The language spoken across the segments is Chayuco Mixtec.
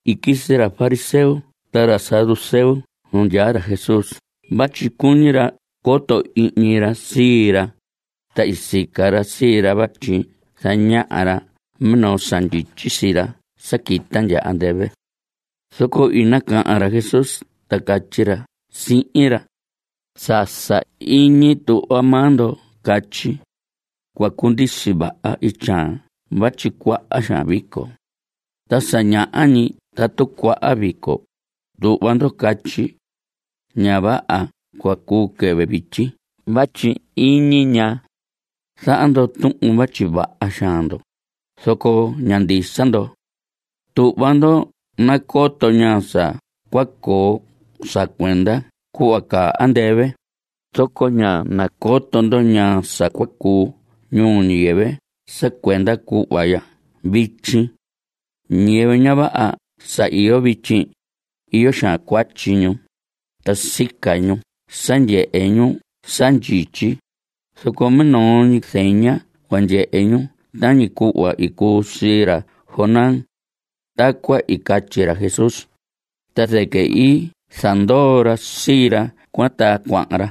I quisi ra fariseo ta ra saduceo nu ndyaa ra Jesús vatyi cuñi ra coto ihñi ra sii ra, ta i sica ra sii ra vatyi zañaha ra minoo sa ndyityi sii ra sa quita ndya andɨvɨ. Zoco i nacahan ra Jesús ta catyi ra sihin ra: Sa sahiñi tuhva maa ndo catyi: “Cua cundisi vaha ityaan vatyi cuaha xaan vico.” Ta sa ñaha ñi tatu cuaha vico, tuhva ndo catyi: “Ña vaha cua cuu quɨvɨ vityi vatyi iñi ñaa.” Zaha ndo tuhun vatyi vaha xaan ndo, zoco ña ndisa ndo. Tuhva ndo nacoto ñaa sa cua coo sa cuenda cuhva caa andɨvɨ, zoco ña nacoto ndo ñaa sa cua cuu ñuu ñiyɨvɨ sa cuenda cuhva ya vityi. Ñiyɨvɨ ña vaha sa iyo vityi, iyo xaan cuatyi ñu, ta sica ñu sa ndyehe ñu sa ndyityi, zoco minoo ñi zeña cua ndyehe ñu tañi cuhva i cuu sii ra Jonás. Tacuan i catyi ra Jesús, ta zɨquɨ i zandoo ra sii ra cuan ta cuahan ra.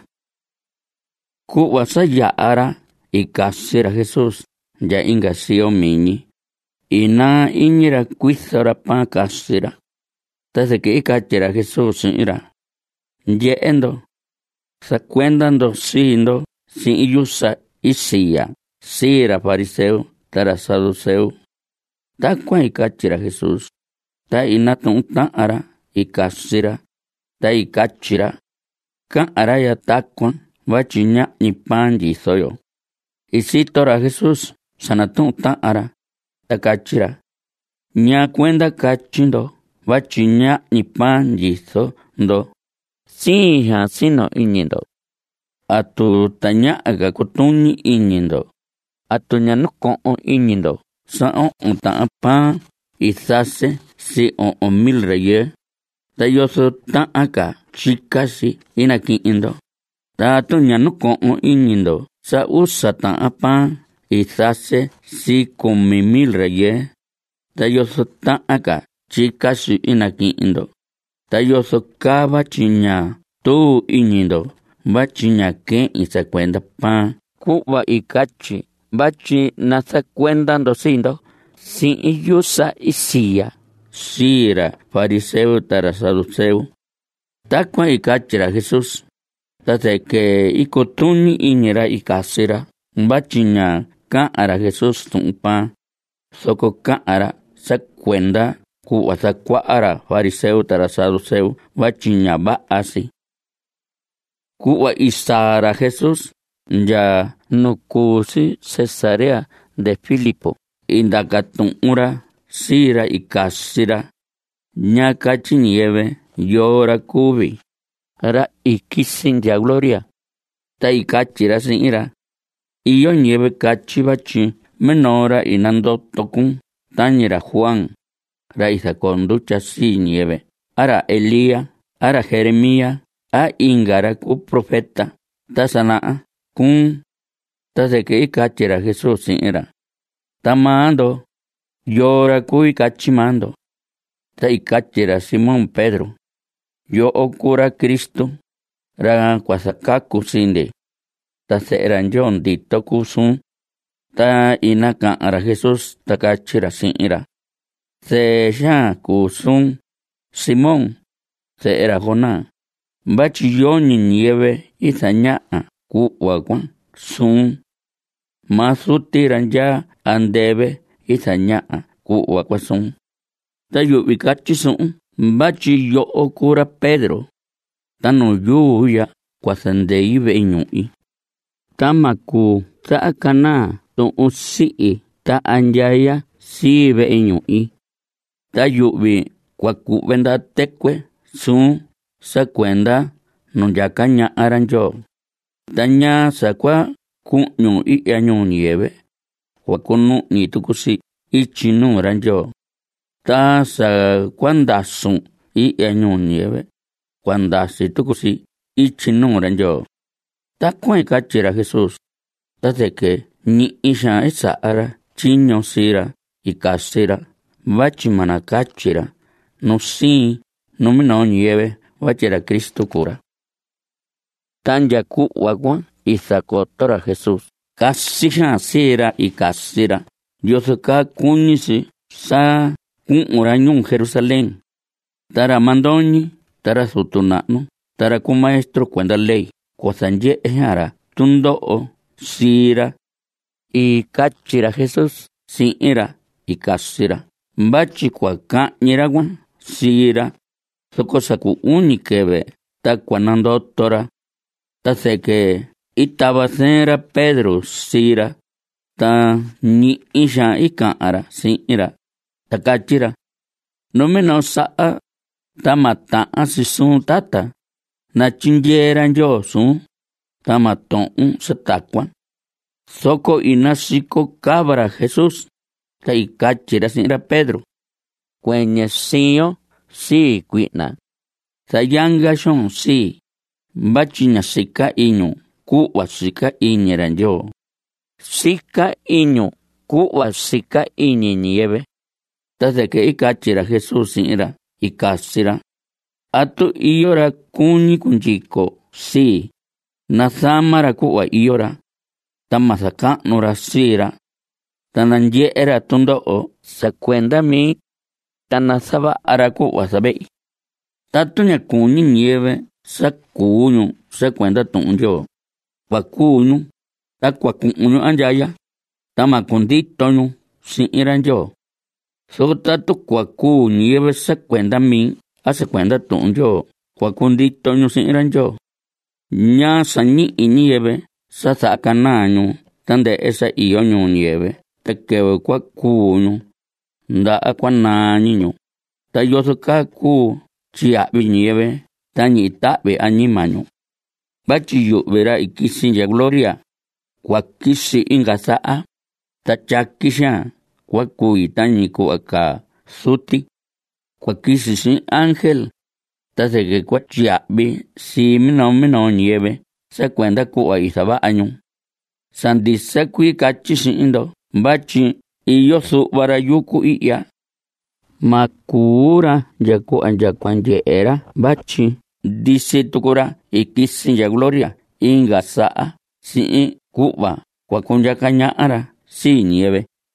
Cuhva sa yaha ra i casi ra Jesús ndya inga siyo miñi, i naa iñi ra cuizo ra pan casi ra. Ta zɨquɨ i catyi ra Jesús sihin ra: Ndyehe ndo. Zacuenda ndo sii ndo sihin yusa i siya sii ra fariseo ta ra saduceo. Tacuan i catyi ra Jesús, ta i natuhun tahan ra i casi ra, ta i catyi ra: Cahan ra tacuan vatyi ñahñi pan ndyizo yo. I sito ra Jesús sa natuhun ra, ta catyi ra: ¿Ñaa cuenda catyi ndo vatyi ñahñi pan ndyizo ndo? ¡Siin xaan sino iñi ndo! ¿Atu tañaha ca cutuñi iñi ndo? ¿Atu ña nacohon iñi ndo sa ohon tahan pan i zase sii ohon mil rayɨɨ? ¿Ta yozo tahan ca tyica si i naquihin ndo? Ta ¿atu ña nacohon iñi ndo sa usa tahan pan i zase sii cumi mil rayɨɨ? ¿Ta yozo tahan ca tyica si i naquihin ndo? ¿Ta yozo caa vatyi ña tuu iñi ndo vatyi ñá quehin sa cuenda pan cuhva i catyi vatyi nazacuenda ndo sii ndo sihin yusa i siya sii ra fariseo ta ra saduceo? Tacuan i catyi ra Jesús, ta zɨquɨ i cutuñi iñi ra i casi ra vatyi ña cahan ra Jesús tuhun pan, zoco cahan ra sa cuenda cuhva zacuaha ra fariseo ta ra saduceo (vatyi ña vaha si). Cuhva i saa ra Jesús ndya nu cu si Cesarea de Filipo i ndaca tuhun ra sii ra i casi ra: ¿Ñaa catyi ñiyɨvɨ yoo ra cuu vii, ra i quisi ndya gloria? Ta i catyi ra sihin ra: Iyo ñiyɨvɨ catyi vatyi minoo ra i nandoto cuun tañi ra Juan, ra i zacoo ndutya sii ñiyɨvɨ a ra Elías a ra Jeremías a inga ra cu profeta ta sa naha cuun. Ta zɨquɨ i catyi ra Jesús sihin ra: Ta maa ndo, ¿yoo ra cui catyi maa ndo? Ta i catyi ra Simón Pedro: Yoho cuu ra Cristo, ra cua zacacu sii ndi. Ta zehe ra Ndyoo ndito cuu suun. Ta i nacahan ra Jesús, ta catyi ra sihin ra: Zɨɨ xaan cuu suun, Simón, zehe ra Jonás, vatyi yoñi ñiyɨvɨ zañaha cuhva cuan suun. Maa Zuti ra ndyaa andɨvɨ i zañaha cuhva cuan suun. Ta yuhvi catyi suhun vatyi yoho cuu ra Pedro. Ta nu yuu ya cua zandei vehe ñuhi, ta ma cuu zahacanaa tuhun sihi ta andyaya sii vehe ñuhi. Ta yuhvi cua cuhve ndaha tɨcuɨ suun sa cuenda nu ndyaca ñaha ra Ndyoo, ta ñaa sa cua cuhñun ihya ñuu ñiyɨvɨ, cua cunuhñi tucu si ityi nuu ra Ndyoo. Ta sa cua ndasun ihya, ñuu ñiyɨvɨ, cua ndasi tucu si ityi nuu ra Ndyoo. Tacuan i catyi ra Jesús, ta zɨquɨ ñihi xaan i saha ra tyiño sii ra i casi ra vatyi ma nacatyi ra nu sihin minoo ñiyɨvɨ vatyi ra Cristo cuu ra. Ta ndya cuhva cuan i zacoto ra Jesús casi xaan sii ra i casi ra yozo caa cuñi si sa cuhun ra ñuu Jerusalén. Ta ra mandoñi ta ra zutu nahnu ta ra cu maestro cuenda ley cua zandyehe xaan ra tundoho sii ra. I catyi ra Jesús sihin ra i casi ra vatyi cua cahñi ra cuan sii ra, zoco sa cu uñi quɨvɨ ta cua nandoto ra. Ta zɨquɨ i tava zɨɨn ra Pedro sii ra, ta ñihi xaan i cahan ra sihin ra, ta catyi ra: ¡Numinoo saha, ta ma tahan si suun, tata! ¡Natyindyee ra Ndyoo suun, ta ma tohon sa tacuan! Zoco i nasico cava ra Jesús, ta i catyi ra sihin ra Pedro: ¡Cuɨñɨ siyon sii, cuihna! Zayanga xoon sii, vatyi ña sica iñun cuhva sica iñi ra Ndyoo. Sica iñun cuhva sica iñi ñiyɨvɨ. Ta zɨquɨ i catyi ra Jesús sihin ra i casi ra: Tatu iyo ra cuñi cundyico sii, nazama ra cuhva iyo ra. Ta ma zacahnu ra sii ra. Ta nandyehe ra tundoho sa cuenda mi. Ta nazavaha ra cuhva zavehi. Tatu ña cuñi ñiyɨvɨ sa cuu ñu sa cuenda Tuhun Ndyoo, cua cuu ñu, ta cua cuhun ñu andyaya, ta ma cundito ñu sihin ra Ndyoo. Zoco tatu cua cuu ñiyɨvɨ sa cuenda mi a sa cuenda Tuhun Ndyoo cua cundito ñu sihin ra Ndyoo. ¿Ñaa sa ñihi ñiyɨvɨ sa zahacanaa ñu tandɨhɨ sa iyo ñuu ñiyɨvɨ ta quɨvɨ cua cuu ñu, ndaha cua naa ñi ñu? ¿Ta yozo caa cuu tyiyahvi ñiyɨvɨ ta ñihi tahvi añima ñu? Vatyi yuhvi, ra i quisi ndya gloria, cua quisi inga saha, ta tyaqui xaan cua cui tañi cuhva caa Zuti. Cua quisi sihin ángel, ta zɨquɨ cua tyiyahvi sii minoo minoo ñiyɨvɨ sa cuenda cuhva i zavaha ñu. Sa ndisa cuii catyi sihin ndo vatyi iyo zuhva ra yucu ihya, ma cuu ra ndya cuhva ndya cua ndyehe ra vatyi ndisi tucu ra i quisi ndya gloria inga saha sihin cuhva cua cundyaca ñaha ra sii ñiyɨvɨ.